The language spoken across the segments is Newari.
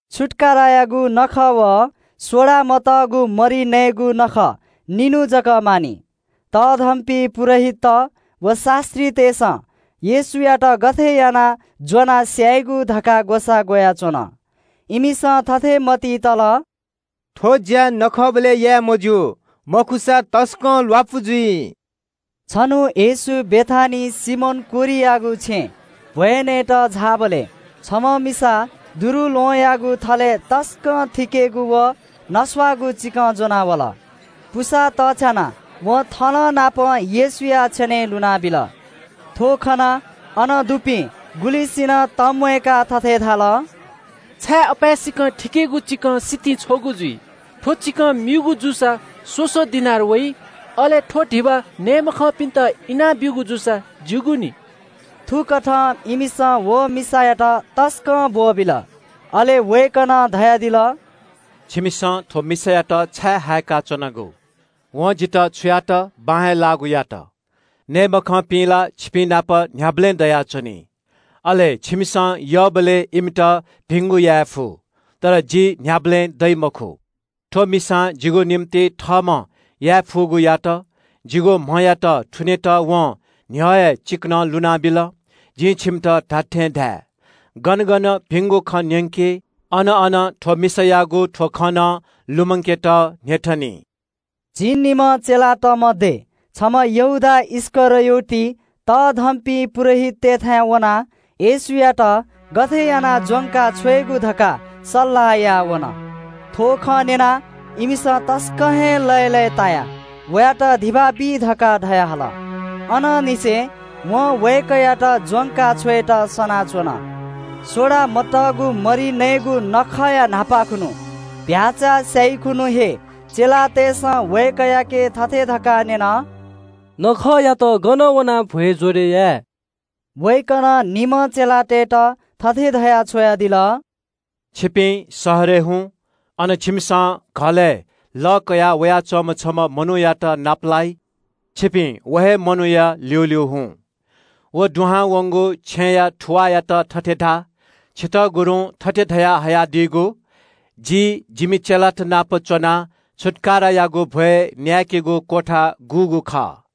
छुत्‍काराया नखः व सोडा मतःगु मरि नयेगु नखः निन्‍हु जक मानि। तःधंपिं पुजाहारीत व शास्‍त्रीतय्‌सं येशूयात गथे यानाः ज्‍वनाः स्‍यायेगु धकाः ग्‍वसाः ग्‍वयाच्‍वन। इमिसं थथे मतिइ तल – “थ्‍व ज्‍या नखःबलय् याये मज्‍यू, मखुसा तसकं ल्‍वापु जुइ।” छन्‍हु येशू बेथानियाय् सिमोन कोह्रियागु छेँय् भ्‍वय् नयेत झाःबलय् छम्‍ह मिसा दुरुल्‍वहंयागु थलय् शुद्धगु तसकं थिकेगु व नस्‍वाःगु चिकं ज्‍वनाः वल। अले थलयाःगु पुसा चायेकाः वं चिकनं येशूया छेनय् लुनाबिल। थ्‍व खनाः अन दुपिं गुलिंसिनं तंम्‍वयेकाः थथे धाल – “छाय् अपाय्‌सकं थिकेगु चिकं सितिं छ्वःगु जुइ? थ्‍व चिकं म्‍यूगु जूसा स्‍वसः दिनार वइ। अले थ्‍व धिबा नये मखंपिन्‍त इनाब्‍यूगु जूसा ज्‍यूगु नि।” थुकथं इमिसं व मिसायात तसकं ब्‍वःबिल। अले वय्‌कलं धयादिल – “छिमिसं थ्‍व मिसायात छाय् हायेका च्‍वनागु? वं जितः छु यात बां हे लाःगु यात। नये मखंपिं ला छिपिंनाप न्‍ह्याबलें दयाच्‍वनी, अले छिमिसं यःबलय् इमित भिंगु याये फु। तर जि न्‍ह्याबलें दइ मखु। थ्‍व मिसां जिगु निंतिं थःम्‍हं याये फुगु यात। जिगु म्‍हयात थुनेत वं न्‍ह्यः हे चिकनं लुनाबिल। जिं छिमित धात्‍थें धाये – गन गन भिंगु खँ न्‍यंकी, अन अन थ्‍व मिसां याःगु थ्‍व खँ नं लुमंकेत न्‍ह्यथनी।” झिंनिम्‍ह चेलात मध्‍ये छम्‍ह यहूदा इस्‍करियोत तःधंपिं पुजाहारीतय्‌थाय् वनाः येशूयात गथे यानाः ज्‍वंकाछ्वयेगु धकाः सल्‍लाह याः वन। थ्‍व खँ न्‍यनाः इमिसं तसकं हे लय्‌लय्‌तायाः वयात धिबा बी धकाः धयाहल। अनंनिसें वं वय्‌कःयात ज्‍वंका छ्वयेत सनाच्‍वन। सोडा मतःगु मरि नयेगु नखःया न्‍हापां खुन्‍हु, चीधिकःम्‍ह भ्‍याःचा स्‍याइ खुन्‍हु हे चेलातय्‌सं वय्‌कःयाके थथे धकाः न्‍यन – “छिगु निंतिं गन वनाः छुत्‍काराया नखःया भ्‍वय् ज्‍वरय् याये?” वय्‌कलं निम्‍ह चेलातय्‌त थथे धयाः छ्वयादिल – “छिपिं शहरय् हुँ, अन छिमिसं घलय् लः कयावयाच्‍वंम्‍ह छम्‍ह मनूयात नापलाइ। छिपिं व हे मनूया ल्‍यूल्‍यू हुँ। व दुहां वंगु छेँया थुवाःयात थथे धा – ‘छितः गुरुं थथे धया हयादीगु, “जि जिमि चेलात नाप च्‍वनाः छुत्‍काराया नखःया भ्‍वय् न्‍याय्‌केगु क्‍वथा गुगु खः?”’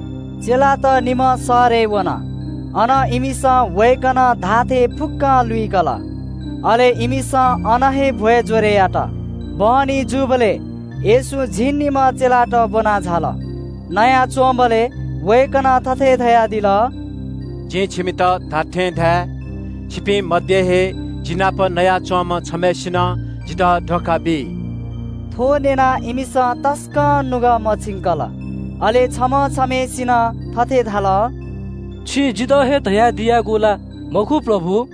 चेलात निम्‍ह शहरय् वन, अन इमिसं वय्‌कलं धाःथें फुक्‍कं लुइकल। अले इमिसं अन हे छुत्‍काराया नखःया भ्‍वय् ज्‍वरय् यात। बहनी जूबलय् येशू झिंनिम्‍हं चेलात ब्‍वनाः झाल। नयाच्‍वंबलय् वय्‌कलं थथे धयादिल – “जिं छिमित धात्‍थें धाये, छिपिं मध्‍ये हे जि नाप नयाच्‍वंम्‍ह छम्‍हय्‌सिनं जितः धोखा बी।” थ्‍व न्‍यनाः इमिसं तसकं नुगः मछिंकल। अले छम्‍ह छम्‍हय्‌सिनं थथे धाल – “छिं जितः हे धयादियागु ला मखु प्रभु?”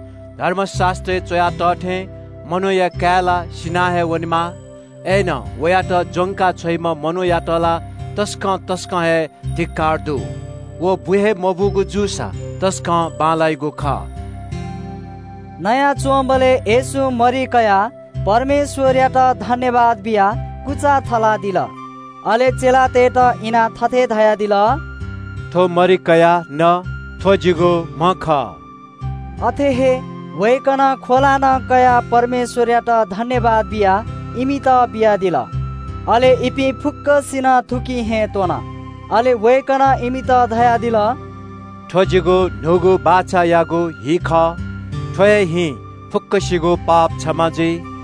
धर्मशास्‍त्रय् च्‍वया तः थें मनूया काय् ला सिना हे वनेमाः। अय्‌नं वयात ज्‍वंका छ्वइम्‍ह मनूयात ला तसकं तसकं हे धिक्‍कार दु। व बु हे मबूगु जूसा तसकं बांलाइगु खः।” नयाच्‍वंबलय् येशूं मरि कयाः परमेश्‍वरयात सुभाय् बियाः कुचा थलादिल। अले चेलातय्‌त इनाः थथे धयादिल – “थ्‍व मरि कयाः न, थ्‍व जिगु म्‍ह खः।” अथे हे वय्‌कलं ख्‍वला नं कयाः परमेश्‍वरयात सुभाय् बियाः इमित बियादिल, अले इपिं फुक्‍कसिनं थुकिं हे त्‍वन। अले वय्‌कलं इमित धयादिल – “थ्‍व जिगु न्‍हूगु बाचायागु हि खः। थ्‍व हे हिं यक्‍वसिगु पाप क्षमा जुइ।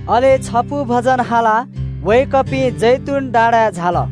अले छपु भजन हालाः वय्‌कःपिं जैतून डाँडाय् झाल।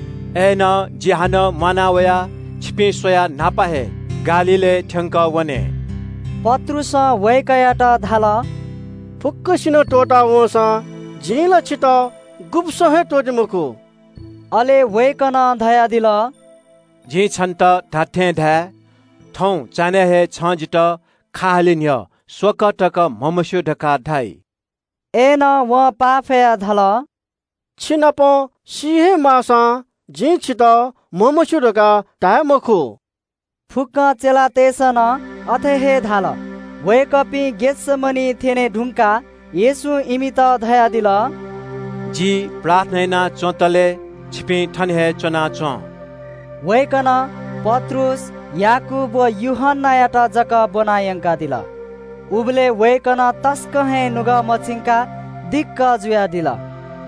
“अय्‌नं जि हानं म्‍वाना वयाः छिपिं स्‍वयाः न्‍हापा हे गालीलय् थ्‍यंकः वने।” पत्रुसं वय्‌कःयात धाल – “फुक्‍कसिनं त्‍वःता वंसां जिं ला छितः गुब्‍सं हे त्‍वःते मखु।” अले वय्‌कलं धयादिल – “जिं छन्‍त धात्‍थें धाये – थौं चान्‍हय् हे छं जितः खा हाले न्‍ह्यः स्‍वकः तक म्‍हमस्‍यू धकाः धाइ।” अय्‌नं वं पाफयाः धाल – “छिनाप सी हे माःसां जिं छितः म्‍हमस्‍यू धकाः धाये मखु।” फुक्‍क चेलातय्‌सं नं अथे हे धाल। वय्‌कःपिं गेतसमनिइ थ्‍यने धुंकाः येशूं इमित धयादिल – “जि प्रार्थना यानाच्‍वंतले छिपिं थन हे च्‍वनाच्‍वँ।” वय्‌कलं पत्रुस, याकूब व यूहन्‍नायात जक ब्‍वना यंकादिल। उबलय् वय्‌कलं तसकं हे नुगः मछिंकाः दिक्‍क जुयादिल।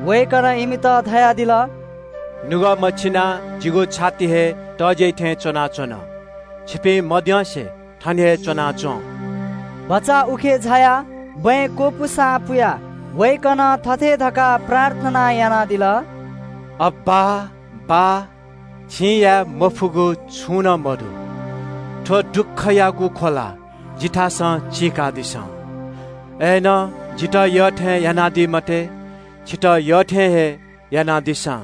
वय्‌कलं इमित धयादिल – “नुगः हीसे च्‍वनाः जिगु छाति हे तज्‍याइ थें च्‍वनाच्‍वन। छिपिं मद्यंसे थन हे च्‍वनाच्‍वँ।” भचा उखे झायाः बँय् क्‍वपुसां पुयाः वय्‌कलं थथे धकाः प्रार्थना यानादिल – “अब्‍बा, बाः, छिं याये मफुगु छुं नं मदु। थ्‍व दुःखयागु ख्‍वला जिथासं चीकादिसँ। अय्‌नं जितः यःथें यानादी मते, छितः यःथें हे यानादिसँ।”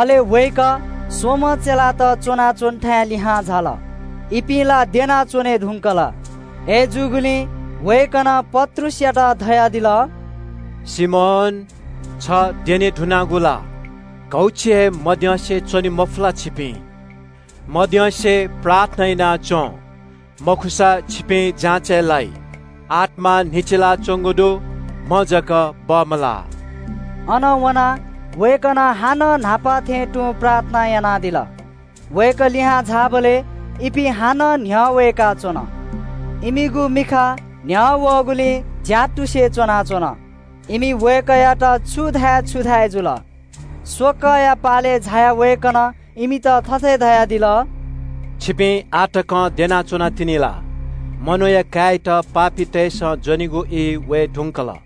अले वय्‌कः स्‍वम्‍ह चेलात च्‍वनाच्‍वंथाय् लिहां झाल। इपिं ला द्यना च्‍वने धुंकल। अय्‌जूगुलिं वय्‌कलं पत्रुसयात धयादिल – “सिमोन, छ द्यने धुनागु ला? घौछि हे मद्यंसे च्‍वने मफु ला छिपिं? मद्यंसे प्रार्थना याना च्‍वँ, मखुसा छिपिं जाँचय् लाइ। आत्‍मा ला तयार दु, म्‍ह धाःसा बमलाः।” अनं वनाः वय्‌कलं हानं न्‍हापा थें तुं प्रार्थना यानादिल। वय्‌कः लिहां झाःबलय् इपिं हानं न्‍ह्यः वय्‌काच्‍वन। इमिगु मिखा न्‍ह्यः वःगुलिं झ्‍यातुसे च्‍वनाच्‍वन। इमि वय्‌कःयात छु धाये छु धाये जुल। स्‍वकःया पालय् झायाः वय्‌कलं इमित थथे धयादिल – “छिपिं आः तकं द्यना च्‍वनातिनि ला? मनूया काय्‌यात पापीतय्‌सं ज्‍वनेगु ई वये धुंकल।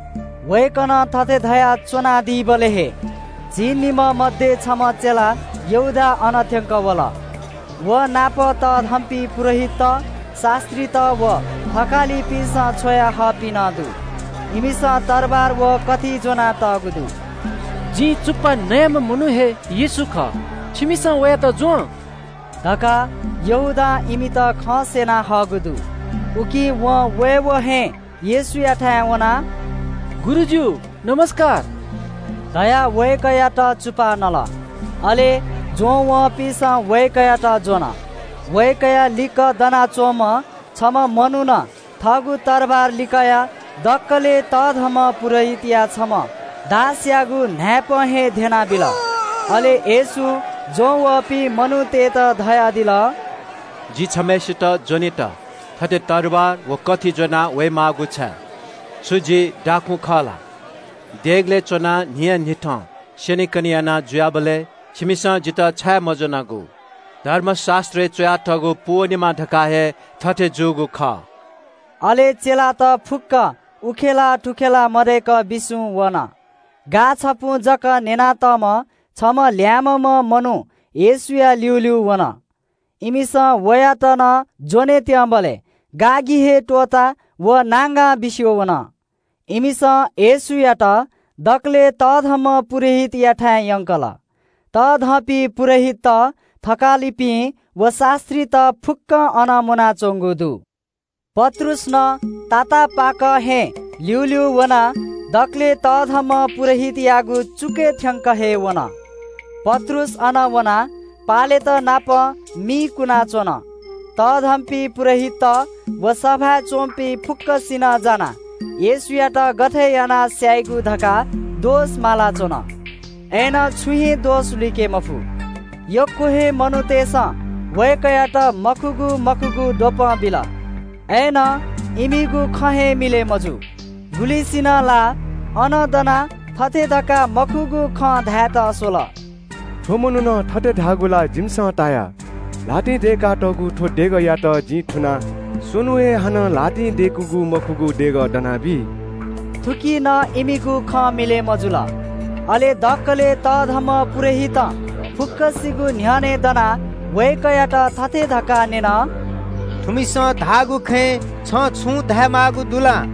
वय्‌कलं थथे धयाच्‍वनादीबलय् हे झिंनिम्‍ह मध्‍ये छम्‍ह चेला यहूदा अन थ्‍यंकः वल। व नाप तःधंपिं पुजाहारीत, शास्‍त्रीत व थकालितय्‌सं छ्वयाहःपिं नं दु। इमिसं तरवार व कथि ज्‍वनातःगु दु। “जिं चुप्‍पा नयाम्‍ह मनू हे येशू खः, छिमिसं वयात ज्‍वँ” धकाः यहूदां इमित खँ स्‍यना हःगु दु। उकिं वं वय्‌वं हे येशूयाथाय् वनाः – “गुरुजु” धयाः वय्‌कःयात चुप्‍पा नल। अले ज्‍वं वःपिन्‍सं वय्‌कःयात ज्‍वन। वय्‌कःया लिक्‍क दनाच्‍वंम्‍ह छम्‍ह मनुखं थःगु तरवार लिकयाः दकलय् तःधंम्‍ह पुजाहारीया छम्‍ह दासयागु न्‍हाय्‌पं हे ध्‍यनाबिल। अले येशूं ज्‍वंवःपिं मनूतय्‌त धयादिल – “जि छम्‍हय्‌सित ज्‍वनेत थथे तरवार व कथि ज्‍वनावये माःगु छाय्? छु जि दाखुँ खः ला? देगलय् च्‍वनाः न्‍हियान्‍हिथं स्‍यनेकने याना जुयाबलय् छिमिसं जितः छाय् मज्‍वनागु? धर्मशास्‍त्रय् च्‍वयातःगु पूवनेमा धकाः हे थथे जूगु खः।” अले चेलात फुक्‍क उखेलाः थुखेलाः मदय्‌क बिस्‍युं वन। गा छपुं जक न्‍ययातःम्‍ह छम्‍ह ल्‍याय्‌म्‍हम्‍ह मनू येशूया ल्‍यूल्‍यू वन। इमिसं वयात नं ज्‍वने त्‍यंबलय् गा हे त्‍वःताः व नांगां बिस्‍युं वन। इमिसं येशूयात दकलय् तःधंम्‍ह पुजाहारीयाथाय् यंकल। तःधंपिं पुजाहारीत, थकालित व शास्‍त्रीत फुक्‍कं अन मुनाच्‍वंगु दु। पत्रुस नं तातापाकं हे ल्‍यूल्‍यू वनाः दकलय् तःधंम्‍ह पुजाहारीयागु चुकय् थ्‍यंक हे वन। पत्रुस अन वनाः पालेत नाप मि पनाच्‍वन। तःधंपिं पुजाहारीत व सभाय् च्‍वंपिं फुक्‍कसिनं जानाः येशूयात गथे यानाः स्‍यायेगु धकाः दोष माला च्‍वन, अय्‌नं छुं हे दोष लुइके मफु। यक्‍व हे मनूतय्‌सं वय्‌कःयात मखुगु मखुगु द्वपं बिल। अय्‌नं इमिगु खँ हे मिलय् मजू। गुलिसिनं ला अन दनाः थथे धकाः मखुगु खँ धायेत स्‍वल – “थ्‍व मनुखं थथे धाःगु ला जिमिसं ताया – ‘ल्‍हातिं दय्‌कातःगु थ्‍व देगःयात जिं थुनाः स्‍वन्‍हुं हे हानं ल्‍हातिं दय्‌किगु मखुगु देगः दना बी।’” थुकी नं इमिगु खँ मिलय् मजुल। अले दकलय् तःधंम्‍ह पुजाहारीं फुक्‍कसिगु न्‍ह्यःने दनाः वय्‌कःयात थथे धकाः न्‍यन – “छ छाय् न्‍वःमवासे च्‍वनागु? थुमिसं धाःगु खँय् छं छुं धायेमाःगु दु ला?”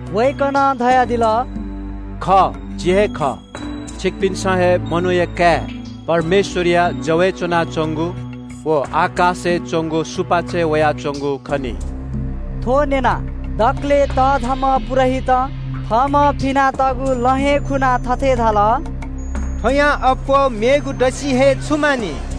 वय्‌कलं धयादिल – “खः, जि हे खः, छिकपिन्‍सं हे मनूया काय् परमेश्‍वरया जवय् च्‍वनाच्‍वंगु व आकाशय् च्‍वंगु सुपाँचय् वयाच्‍वंगु खनी।” थ्‍व न्‍यनाः दकलय् तःधंम्‍ह पुजाहारीं थःम्‍हं फिनातःगु लं हे खुनाः थथे धाल – “थ्‍वयां अप्‍वः मेगु दसि हे छु मानि?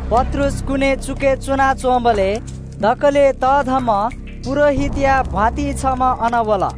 पत्रुस कुने चुकय् च्‍वनाच्‍वंबलय् दकलय् तःधंम्‍ह पुजाहारीया भ्‍वातिं छम्‍ह अन वल।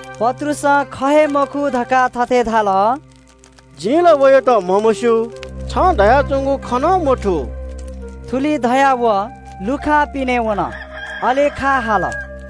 पत्रुसं ख हे मखु धकाः थथे धाल – “जिं ला वयात म्‍हमस्‍यू। छं धयाच्‍वंगु खँ नं मथू।” थुलि धयाः व लुखां पिने वन। अले खा हाल।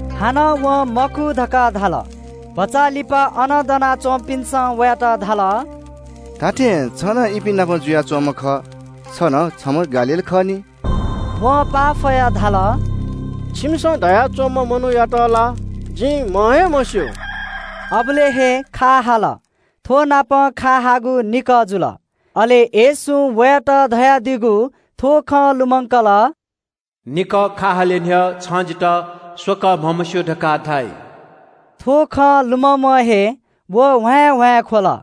हानं वं मखु धकाः धाल। भचा लिपा अन दना च्‍वंपिन्‍सं वयात धाल – “धात्‍थें छ नं इपिं नाप जुयाच्‍वंम्‍ह खः, छ नं छम्‍ह गालीली खः नि।” वं पाफयाः धाल – “छिमिसं धया च्‍वंम्‍ह मनूयात ला जिं म्‍ह हे मस्‍यू।” अबलय् हे खा हाल। थ्‍वनापं खा हाःगु निकः जुल। अले येशूं वयात धयादीगु थ्‍व खँ लुमंकल – “निकः खा हाले न्‍ह्यः छं जितः स्‍वकः म्‍हमस्‍यू धकाः धाइ।” थ्‍व खँ लुममं हे व ह्वाँय्‌ह्वाँय् ख्‍वल।